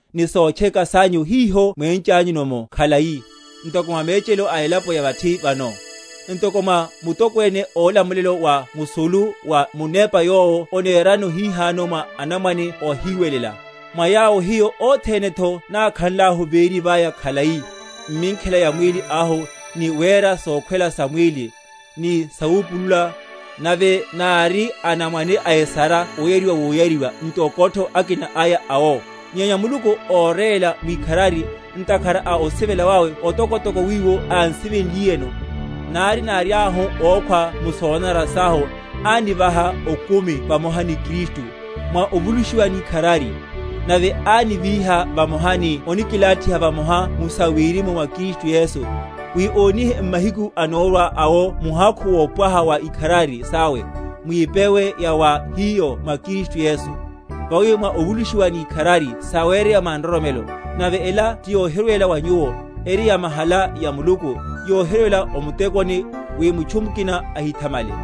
ni sotcheka sanyu, hiho mwéchanyu’mo khalai, ntoko mwa mechelo a elapo ya vathi vano, ntoko mwa mutokwene ólamulelo wa musulu, wa munepa yowo onerano hihano mwa anamwane óhiwelela; mwa yawo hiyo othenetho nákhanlahu véri vaya khalai, m’minkhela ya mwíli ahu, ni wera sokhwela sa mwíli, ni sawupulula, nave nári anamwane a esara oyariwa woyariwa, ntokotho akiko aya awo; nyenya Muluku, óréla mwikharari, ntakhara a osivela wawe otokotoko wiwo ánsivenliyeno, nari náriahu ókhwa mu sonanara sahu, ánivaha okumi vamoha ni Kristu (mwa ovulushiwa ni ikharari), nave ánivíha vamoha, ni onikilathiha vamoha mu sawirimu mwa Kristu Yesu; wi ónihe m’mahiku anórwa awo muhakhu wopwaha wa ikharari sawe, mwipewe ya wa hiyo mwa Kristu Yesu. Vawi mwa ovulushiwa ni ikharari sawereya mwa nroromelo, nave ela tiyohirwela wa nyuwo: eri yamahala ya Muluku; yohirwela o mutekoni, wi mutchu mukina ahithamale.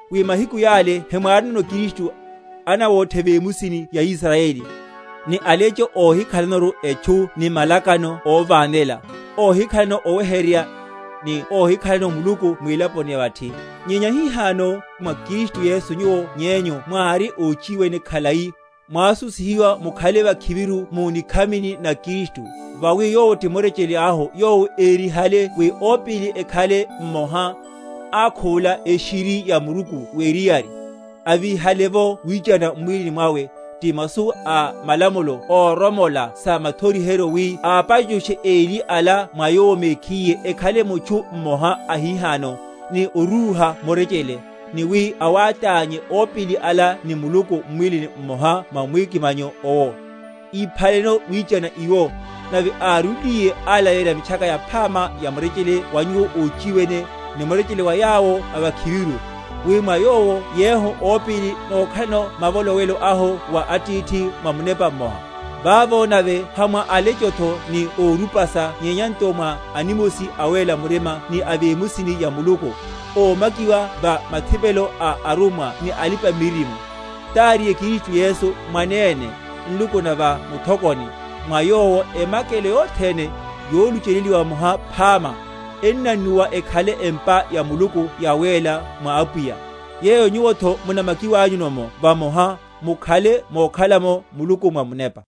wi mahiku yale hemwárinono Kristu, anawóthe vemusi ya Israyeli, ni alecho óhikhalanoru etchu ni malakano óvanelela, óhikhalano oweheryerya, ni óhikhalano Muluku mwilaponi ya vathi. Nyenya hihano mwa Kristu Yesu nyuwo nyenyu mwári óchiwene khalai, mwásusihiwa mukhale vakhiviru mu nikhamini na Kristu. Vawi Yowo ti murechele ahu, yowo érihale wi opíli ekhale mmoha, akhuvula eshiri ya muruku weriyari, avíhale’vo wichana m’mwílini mwawe, ti masu a malamulo óromola sa mathoriheryo; wi apachushe eli ala mwa Yowo mekhiye, ekhale mutchu mmoha ahihano, ni orúha murechele; ni wi awátánye opíli ala ni Muluku, m’mwílini mmoha mwa mwikimanyo owo; íphaleno wichana iwo; nave árúliye, alaleyerya Mitchaka Yaphama ya murechele wa nyuwo óchiwene, ni murechele wa yawo a vakhiviru; wi mwa Yowo yehu opíli nókhalano mavolowelo ahu wa Atithi, mwa Munepa mmoha. Vavo nave ha mwa alechotho ni órupasa nyenya nto mwa animosi a awéla murima ni a vemusi ya Muluku; ómakiwa va mathipelo a arummwa ni alipa‐miririmo, taríye Kristu Yesu mwanene, nluku na va muthokoni; mwa Yowo emakelo yothene, yolucheleliwa vamoha phama, ennannuwa, ekhale empa ya Muluku yawéla mwa Apwiya; yeyo nyuwotho munamakiwanyu’mo vamoha, mukhale mokhala’mo Muluku mwa Munepa.